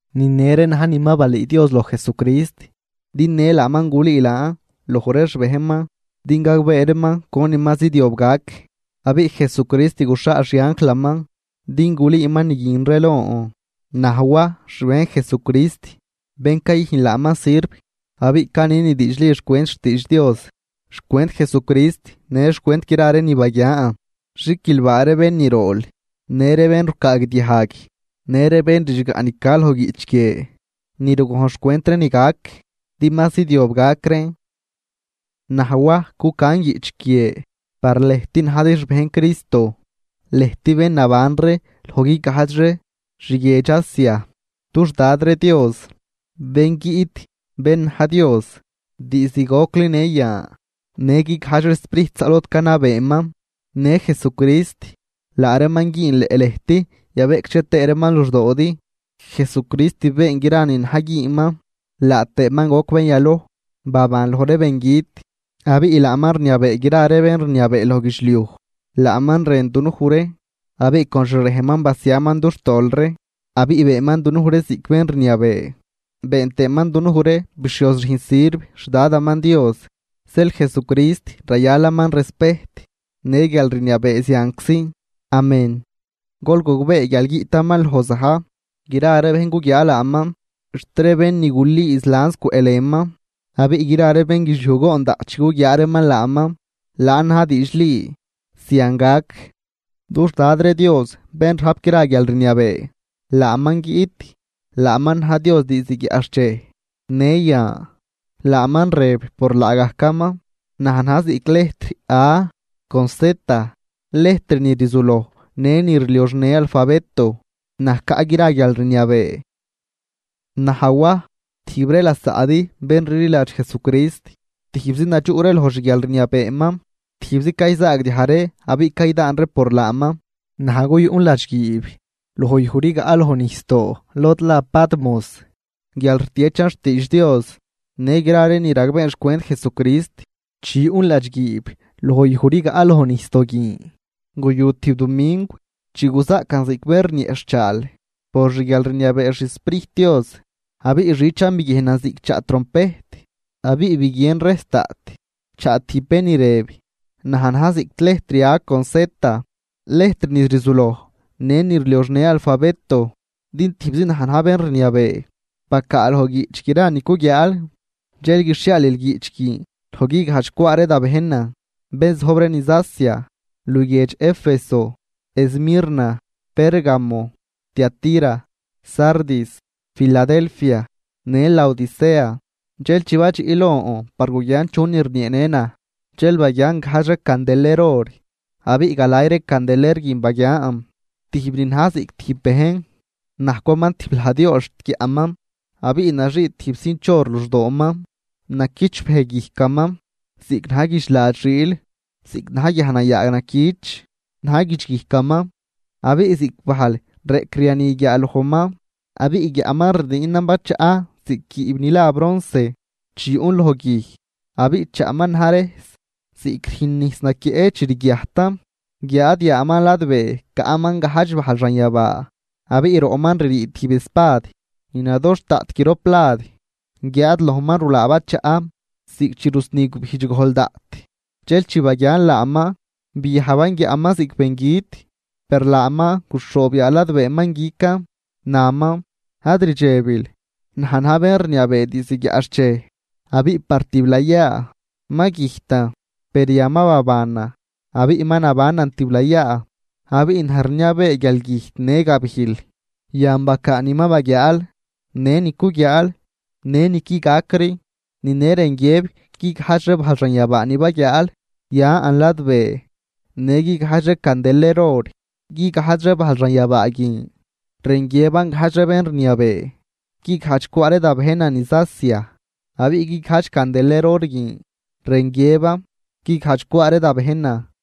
Ni ne ree na̱j ni ma balüü Dios loj Jesucrist din në laaman gulüü laan loj ree xbejnman, din gagbee reeman conin ma zidyob gac. Abiꞌ Jesucrist guxhaal xianjlaman din gulüüman ni guin ree lon, naj Waj xbejn Jesucrist, bén cayüjn laaman sirv. Abiꞌ canin ni diidxli xcwent xtiidx Dios, xcwent Jesucrist në xcwent gra ree ni baguian. Xiquilbaa ree bén ni rool, në ree bén rucaagdiajg në ree bén ridxgaꞌ ni ca loj guiꞌch guie ni rugojn xcwent ree ni gac, din ma zidyob gac reen. Naj Waj cucan guiꞌch guie par lëjt najdi xbejn Cristo, lëjt bén naban ree loj guigajdx ree xguiedx Asia. Dux Dad ree Dios, bén guiꞌt bén na̱j Dios diizd gocli në yan, në guigajdx ree sprijt zaꞌ lod canabeeman, në Jesucrist, laa reeman güünleꞌ lëjt yabeꞌcdxe tëë reeman luxdoodi. Jesucrist been gra ni na̱j güünman, laa tëëman goc bén yaloj baban loj ree bengüt abiꞌ laaman rniabee gra ree bén rniabee loj guidxliuj. Laaman rën dunuj ree abiꞌ con xrejnman basiaman dux tol ree abiꞌ beenman dunuj ree ziꞌc bén rniabee, been tëëman dunuj ree bixhioz rüjn sirv xDadaman Dios. Zeel Jesucrist rayalaman respejt në guialrniabee zianczi. Amén. ¡Gol gogbee guial guiꞌtaman loj za̱j! Gra ree bejn guguiaa laaman xt ree bén ni guliiz lans cwëꞌlënman, abiꞌ gra ree bénguidxliuj goon daꞌt chi guguiaa reeman laaman. Laan na̱j diidxli. Zian gac. Dux Dad ree Dios bén rajp gra guialrniabee. Laaman guiꞌt, laaman na̱j Dios diizd guiaꞌxchej, në yan, laaman rëb por laagajcaman: “Naj na̱j ziꞌc lejtr A con Z, lejtr ni rzuloj në ni rlioxnë alfabeto, naj caꞌ gra guialrniabee.” Naj Waj tijb ree lasaꞌdi bén rliladx Jesucrist. Tijbzi nadxuꞌ ree loj xguialrniabeeman, tijbzi cayzaagdiaj ree abiꞌ caydaan ree por laaman. Naj guyuꞌn ladxguiib loj yuj rigaꞌ loj nijsdoo lod la Patmos guial rtiechan xtiidx Dios në gra ree ni ragbeen xcwent Jesucrist. Chi yuꞌn ladxguiib loj yuj rigaꞌ loj nijsdoo guin, guyu tijb dumingw chi guzaꞌcan ziꞌc bén rnieꞌxhchaal por xguialrniabee xSprijt Dios, abiꞌ xichan biguiejnan ziꞌc chaꞌ trompejt abiꞌ biguien rejs daꞌt chaꞌ tijb bén ni rëb: ―Naj na̱j ziꞌc lejtr A con Z, lejtr ni rzuloj në ni rlioxnë alfabeto, din tijbzi naj na̱j bén rniabee. Bacaa loj guiꞌch gra ni cuguiaal dxel guixhiaalil guiꞌch guin loj guigajdx cwaa ree da bejnan bén zojb ree niz Asia, luguiedx Éfeso, Esmirna, Pérgamo, Tiatira, Sardis, Filadelfia në Laodicea. Dxel chi badxiꞌ lon par guguian chunin rnieenë naj dxel baguian gajdx ree candeler or. Abiꞌ galay ree candeler guin baguian tijb ni na̱j ziꞌc tijb bejn, najcwaman tijb lajd yool xt guiaꞌman, abiꞌ naxii tijb cinch or luxdooman. Naquichbëj guijcaman ziꞌc na̱j guidxlad xiil, ziꞌc na̱j guiajnayaag naquich na̱j guidxguijcaman abiꞌ ziꞌc bajl reꞌcriani guiaalojman. Abiꞌ guiaꞌman rdiinan bachaꞌ ziꞌc guiib ni la bronce chi yuꞌn loj guij, abiꞌ chaꞌman na̱j rejs ziꞌc rüjn nijs naquieꞌ chi rguiajtan. Guiáad yaaman ladbee caꞌman gajdx bajl xanyabaa. Abiꞌ roꞌman ririi tijb Espad ni nadoxh daꞌt grop lad, guiáad lojman rulaa bachaꞌ ziꞌc chi rusni gubijdx gojl daꞌt. Dxel chi baguian laaman biajban guiaꞌman ziꞌc bengüt. Per laaman guxhoob yaa ladbeeman guican, naman: ―Ad rdxebil, naj na̱j bén rniabee diizd guiaꞌxchej abiꞌ par tiblayaa. Ma güjtan, per yan ma babanan, abiꞌ ma nabanan tiblayaa, abiꞌ naj rniabee guialgüjt në gabijl. Yan bacaa ni ma baguiaal në ni cuguiaal në ni qui gacri. Ni në rën guiëb guigajdx ree bajl xanyabaa ni baguiaal yan ladbee, në guigajdx ree candeler or. Guigajdx ree bajl xanyabaa guin rën guiëban gajdx ree bén rniabee guigajdx cwaa ree da bejnan niz Asia, abiꞌ guigajdx candeler or guin rën guiëban guigajdx cwaa ree da bejnan.